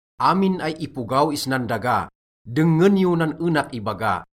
Amin ay ipogaw isnan daga, dengngen yo nan enak ibaga,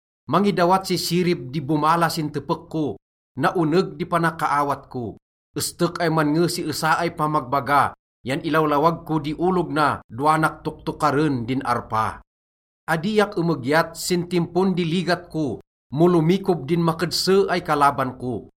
Mangidawat si sirib di bomala sin tepek ko, naoneg di panakaawat ko. Estek ay mannge si esa ay pamagbaga yan ilawlawag ko di olog na dowanak toktokaren din arpa. Adiak emegyat sin timpon di ligat ko mo lomikob din makedse ay kalaban ko.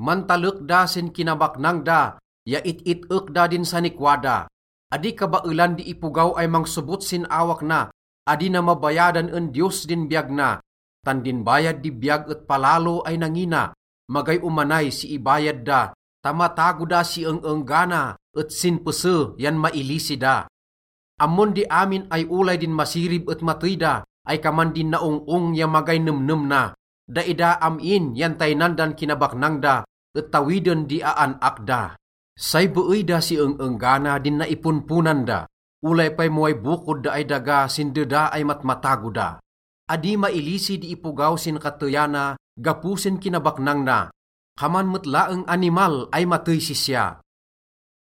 Mantalek da sin kinabaknang da ya it-it-ek da din sanikwa da. Adi kabaelan di ipogaw ay mangsobot sin awak na, adi na mabayadan en Diyos din biyag na. Tan din bayad di biyag et palalo ay nangina, magay omanay si ibayad da ta matago da si eng-enggana et sin pese yan mailisi da. Ammon di amin ay olay din masirib et matey da ay kaman din naong-ong ya magay nemnem na. Daida am-in yan taynan dan kinabaknang da, et tawiden di aan-ak da. Say beey da si eng-enggana din naiponponan da, olay pay mo way bokod da ay daga sin deda ay matmatago da. Adi mailisi di ipogaw sin kateyana gapo sin kinabaknang na. Kaman met laeng animal ay matey sisya.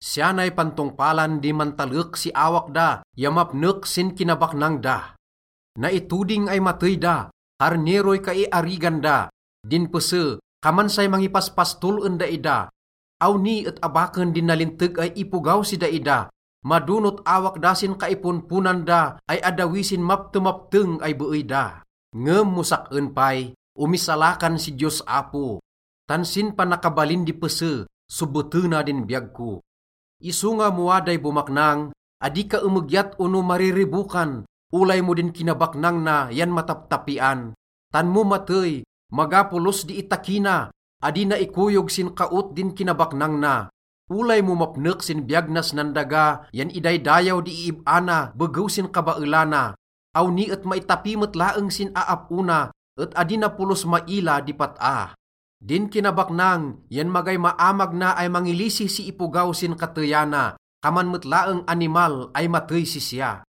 Siya nay pantongpalan di mantalek si awak da ya mapnek sin kinabaknang da: naitoding ay matey da, karneroy kaiarigan da. Din pese, kaman say mangipaspastol en daida. Awni et abaken din nalinteg ay ipogaw si daida, madonot awak da sin kaiponponan da ay addawi sin maptemapteng ay beey da. Ngem mo sak-en pay, omisalakan si Diyos Apo, tan sin panakabalin di pese sobotena din biyag ko. Isonga mo waday bomaknang, adi ka emegyat ono mariribokan, olay mo din kinabaknang na yan mataptapian. Tan mo matey, maga polos di itakina, adi na ikoyog sin kaot din kinabaknang na. Olay mo mapnek sin biyag nas nan daga yan idaydayaw di iib-a na begew sin kabaelana, awni et maitapi met laeng sin aap-o na et adi na polos maila di pat-a. Din kinabaknang yan magay maamag na ay mangilisi si ipogaw sin kateyana. Kaman met laeng animal ay matey sisya.